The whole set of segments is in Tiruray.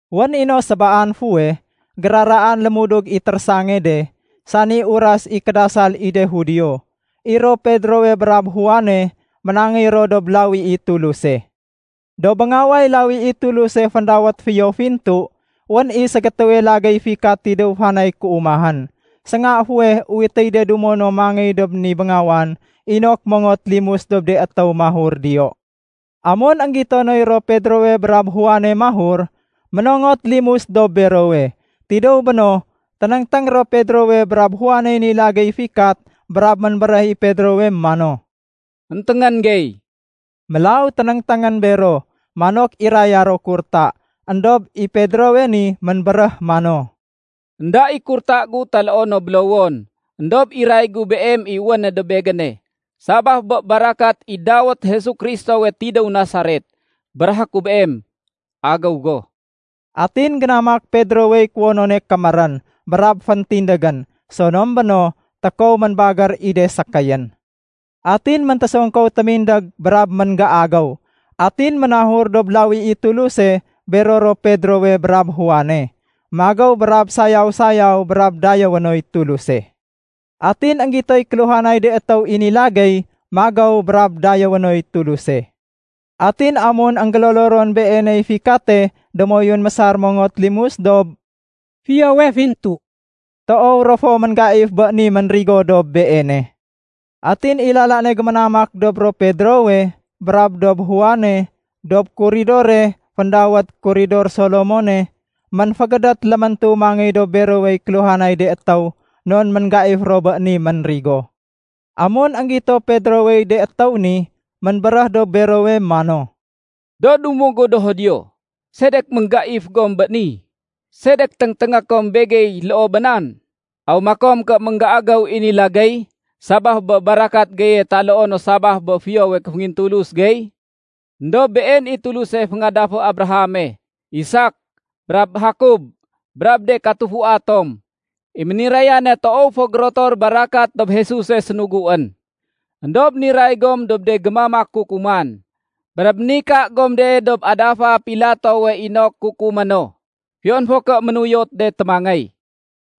Wén i no sébaan fuweh, géraraan lémudug i térésange de, sani uras i kédasal i de Judio, i ro Pedrowe brab Juane ménangéy ro dob lawi i Tuluse. Dob béngaway lawi i Tuluse féndawét “Fiyo Fintu”, wén i ségétéwe lagéy fikat tidéw fanay kéumahén. Sénga fuweh uwitéy de dumo no mangéy dob ni béngawan inok mongot limus dob de étéw mahur diyo. Amun énggito noy ro Pedrowe brab Juane mahur, ménongot limus dob berowe. Tidéw béno, ténéngténg ro Pedrowe brab Juaney ni lagéy fikat brab ménbéréh i Pedrowe mano, “Enténgén gey.” Mélaw ténéngténgén bero, manok iraya ro kurta. Endob i Pedrowe ni ménbéréh mano, “Enda i kurta gu taloo no bélowon, éndob iray gu beem i wéne dob begéne. Sabaf bé barakat i dawét Jesu Kristowe tidéw Nasaret, béréhé ku beem, agéw go!” Atin génamak Pedrowey kuwonone kémérén brab féntindégén. Sonom béno, tékow ménbagér i de sékéyén. Atin méntésongkow témindég brab ménggéagéw. Atin ménahur dob lawi i Tuluse bero ro Pedrowe brab Juane, magéw brab sayaw-sayaw brab dayéwé noy Tuluse. Atin énggitoy kéluhanay de étéw i ni lagéy magéw brab dayéwé noy Tuluse. Atin amun énggélolo ron beeney fikate démoyun mésar mongot limus dob “Fiyowe Fintu”, toow ro fo ménggaif bé ni ménrigo dob beene. Atin i lala ne géménamak dob ro Pedrowe brab dob Juane dob kuridore féndawét “Kuridor Solomone” ménfégédét léméntu mangéy dob berowey kéluhanay de étéw non ménggaif ro bé ni ménrigo. Amun énggito Pedrowey de étéw ni, ménbéréh dob berowe mano, “Do dumo gu do Judio, sedek ménggaif gom bé ni? Sedek téngténgé kom begey loo bé nan? Aw makom ké ménggéagéw i ni lagéy sabaf bé barakat geye taloo no sabaf bé fiyowe kéféngintulus gey? Endob Been i Tuluse féngadafé Abrahame, Isak, brab Jakob, brab de katufua tom, i ménirayane toow fo gérotor barakat dob Jesuse, sénuguén. Endob niray gom dob de gémamak kukuman, brab ménika gom de dob adafa Pilatowe inok kukumé no, fiyon fo ké ménuyot de témangéy.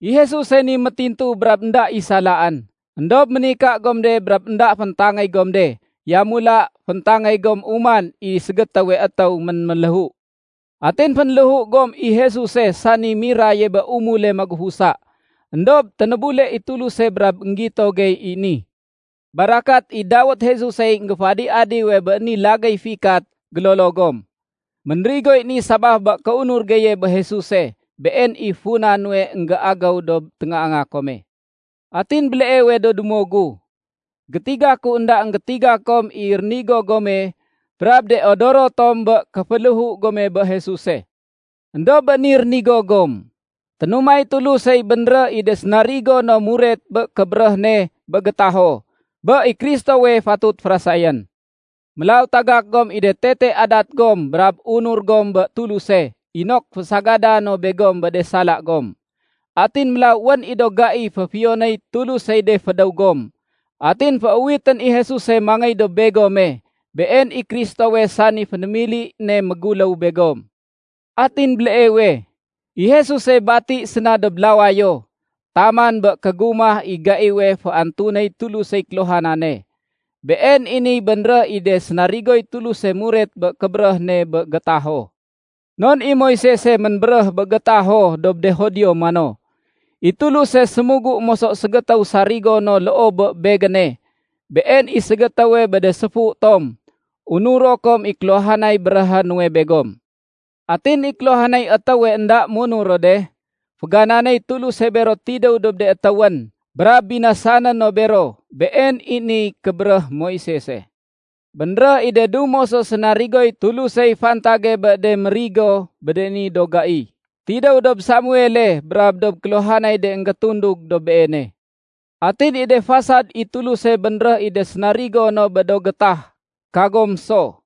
I Jesuse ni métintu brab énda i salaén, éndob ménika gom de brab énda féntangéy gom de. Yamula féntangéy gom uman i ségétéwe étéw ménméléhu. Atin fénléhu gom i Jesuse sani miraye bé umule magufusa. Endob ténébule i Tuluse brab énggito gey i ni. Barakat i dawét Jesusey énggéféadi-adiwe bé ni lagéy fikat gélolo gom. Ménrigoy ni sabaf bé kéunur geye bé Jesuse. Been i funa nuwe énggéagéw dob téngaanga kome. “Atin béleewe do dumo gu, gétiga ku énda énggétiga kom i rénigo gome brab de odoro tom bé kéféléhu gome bé Jesuse. Endob bé ni rénigo gom, ténumay Tulusey bénréh i de sénarigo no muret bé kébéréh ne bé gétaho, bé i Kristowe fatut férasayén. Mélaw tagak gom i de tete adat gom brab unur gom bé Tuluse inok fésagada no begom bé de sala gom. Atin mélaw wén i do gai féfiyonéy Tulusey de fédéw gom. Atin féuwitén i Jesuse mangéy dob begome. Been i Kristowe, sani fénémili ne méguléw begom. Atin béleewe, i Jesuse bati séna dob lawayo taman bé kégumah i gaiwe féantunéy Tulusey kéluhanane. Been i niy bénréh i de sénarigoy Tuluse muret bé kébéréh ne bé gétaho. Non i Moisese ménbéréh bé gétaho dob de Judio mano, ‘I Tuluse sémugu moso ségétéw sarigo no loo bé begéne. Been i ségétéwe bé de séfu tom. Unuro kom i kéluhanay béréhé nuwe begom. Atin i kéluhanay étéwe énda munur ro de, fégananéy Tuluse bero tidéw dob de étéwén, brab binasané no bero.’ Been i niy kébéréh Moisese. Bénréh i de dumo so sénarigoy Tulusey fantage bé de mérigo bé de ni do gai, tidéw dob Samuele brab dob kéluhanay de énggétundug dob beene. Atin i de fasad i Tuluse bénréh i de sénarigo no bé do gétah, kagom so.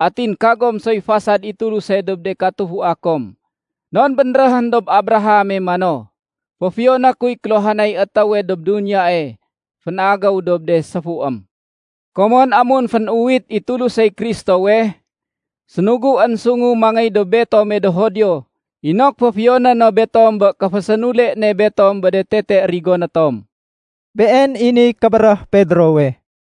Atin kagom soy fasad i Tuluse dob de katufua kom. Non bénréhén dob Abraham mano, ‘Féfiyoné kuy kéluhanay étéwe dob duniyae fénagéw dob de séfuém.’ Komon amun fén-uwit i Tulusey Kristowe, sénuguén sungu mangéy dob betome do Judio inok féfiyoné no betom bé kéfésénule ne betom bé de tete rigoné tom.” Been i niy kébéréh Pedrowe.